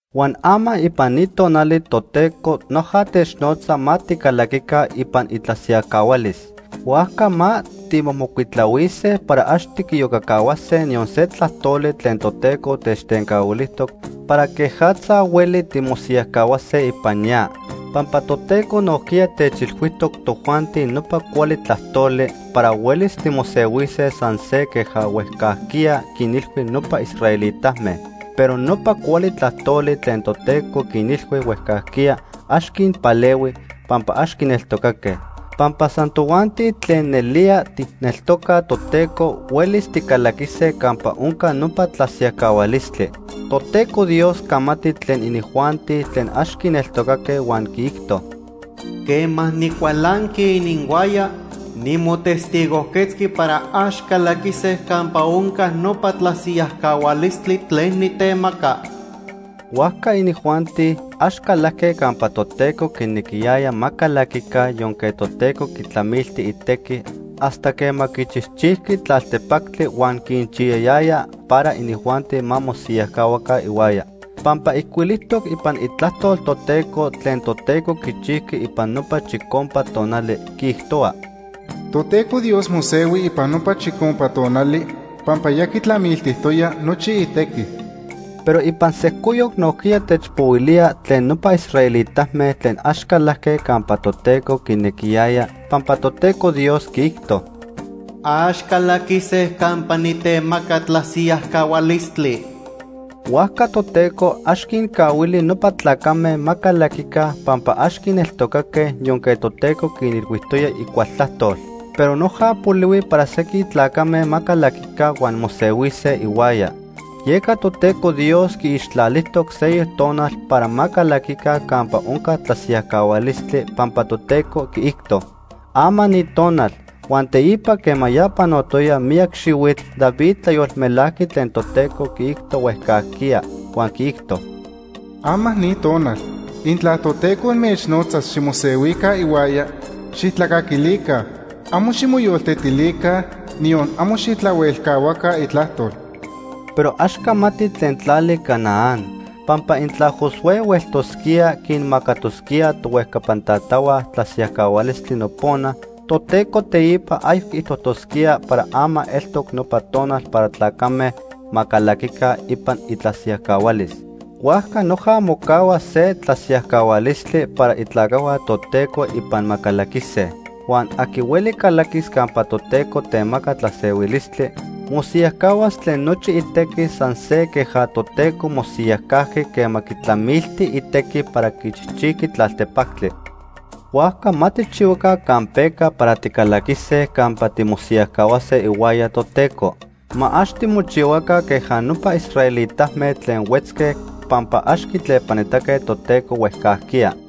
Huan ama ipan ni tonali Toteco noja technotza ma ticalaquica ipan itlasiyajcahualis. Huajca ma timomocuitlahuise para ax tiquiyocacahuase niyon se tlajtoli tlen Toteco techtencahuilijtoc para quejatza hueli timosiyajcahuase ipan ya. Pampa Toteco nojquiya techilhuijtoc tojuanti nopa cuali tlajtoli para huelis timosehuise san se queja huejcajquiya quinilhui nopa israelitame. Pero nopa cuali tlajtoli tlen Toteco quinilhui huejcajquiya ax quinpalehui, pampa ax quineltocaque. Pampa san tojuanti tlen nelía tijneltocaj Toteco huelis ticalaquise campa onca nopa tlasiyajcahualistli. Toteco Dios camati tlen inijuanti tlen ax quineltocaque huan quiijto: “Quema nicualanqui ininhuaya, nimotestigojquetzqui para ax calaquise campa onca nopa tlasiyajcahualistli tlen nitemaca.” Huajca inijuanti ax calajque campa Toteco quinequiyaya ma calaquica yonque Toteco quitlamilti itequi hasta quema quichijchijqui tlaltepactli huan quinchiyayaya para inijuanti ma mosiyajcahuaca ihuaya. Pampa ijcuilijtoc ipan Itlajtol Toteco tlen Toteco quichijqui ipan nopa chicompa tonali, quiijtohua: “Toteco Dios mosehui ipan nopa chicompa tonali pampa ya quitlamiltijtoya nochi itequi.” Pero ipan sejcoyoc nojquiya techpohuilía tlen nopa israelitame tlen ax calajque campa Toteco quinequiyaya, pampa Toteco Dios quiijto: “Ax calaquise campa nitemaca tlasiyajcahualistli.” Huajca Toteco ax quincahuili nopa tlacame ma calaquica pampa ax quineltocaque yonque Toteco quinilhuijtoya icual tlajtol. Pero noja polihui para sequin tlacame ma calaquica huan mosehuise ihuaya. Yeca Toteco Dios quiixtlalijtoc seyoc tonal para ma calaquica campa onca tlasiyajcahualistli, pampa Toteco quiijto: “Ama ni tonal.” Huan teipa quema ya panotoya miyac xihuitl, David tlayolmelajqui tlen Toteco quiijto huejcajquiya, huan quiijto: “Ama ni tonal, intla Toteco inmechnotzas ximosehuica ihuaya, xijtlacaquilica. Amo ximoyoltetilica, niyon amo xijtlahuelcahuaca itlajtol.” Pero ax camati tlen tlali Canaán, pampa intla Josué hueltosquía quinmacatosquía tohuejcapan tatahua tlasiyajcahualistli nopona, Toteco teipa ayoc quiijtosquía para ama eltoc nopa tonal para tlacame ma calaquica ipan itlasiyajcahualis. Huajca noja mocahua se tlasiyajcahualistli para itlacajhua Toteco ipan ma calaquise. Huan aqui hueli calaquis campa Toteco temaca tlasehuilistli, mosiyajcahuas tlen nochi itequi san se queja Toteco mosiyajcajqui quema quitlamilti itequi para quichijchijqui tlaltepactli. Huajca ma tijchihuaca campeca para ticalaquise campa timosiyajcahuase ihuaya Toteco. Ma ax timochihuaca queja nopa israelitame tlen huetzque pampa ax quitlepanitaque Toteco huejcajquiya.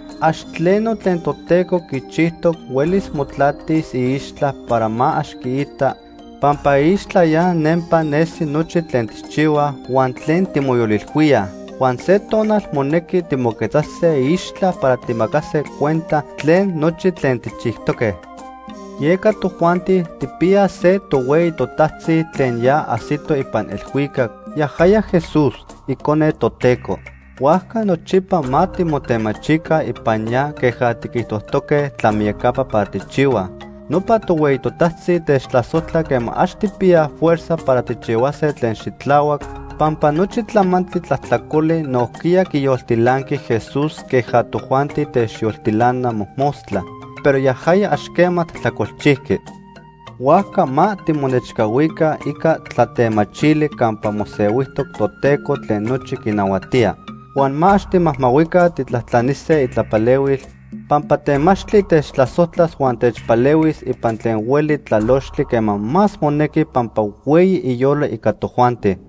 Ax tleno tlen Toteco quichijtoc huelis motlatis iixtla para ma ax quiita, pampa iixtla ya nempa nesi nochi tlen tijchihuaj huan tlen timoyolilhuíaj. Huan se tonal monequi timoquetzase iixtla para tijmacase cuenta tlen nochi tlen tijchijtoque. Yeca tojuanti tijpiyaj se tohueyi totajtzi tlen ya ajsito ipan elhuicac, yajaya Jesús, Icone Toteco. Huajca nochipa ma timotemachica ipan ya queja tiquijtojtoque tlamiyacapa para tijchihuaj. Nopa tohueyi totajtzi techtlasojtla quema ax tijpiyaj fuerza para tijchihuase tlen xitlahuac, pampa nochi tlamantli tlajtlacoli nojquiya quiyoltilanqui Jesús queja tojuanti techyoltilana mojmostla, pero yajaya ax quema tlajtlacolchijqui. Huajca ma timonechcahuica ica tlatemachili campa mosehuijtoc Toteco tlen nochi quinahuatía. Huan ma ax timajmahuica tijtlajtlanise itlapalehuil, pampa temachtli techtlasojtlas huan techpalehuis ipan tlen hueli tlalochtli quema más monequi pampa hueyi iyolo ica tojuanti.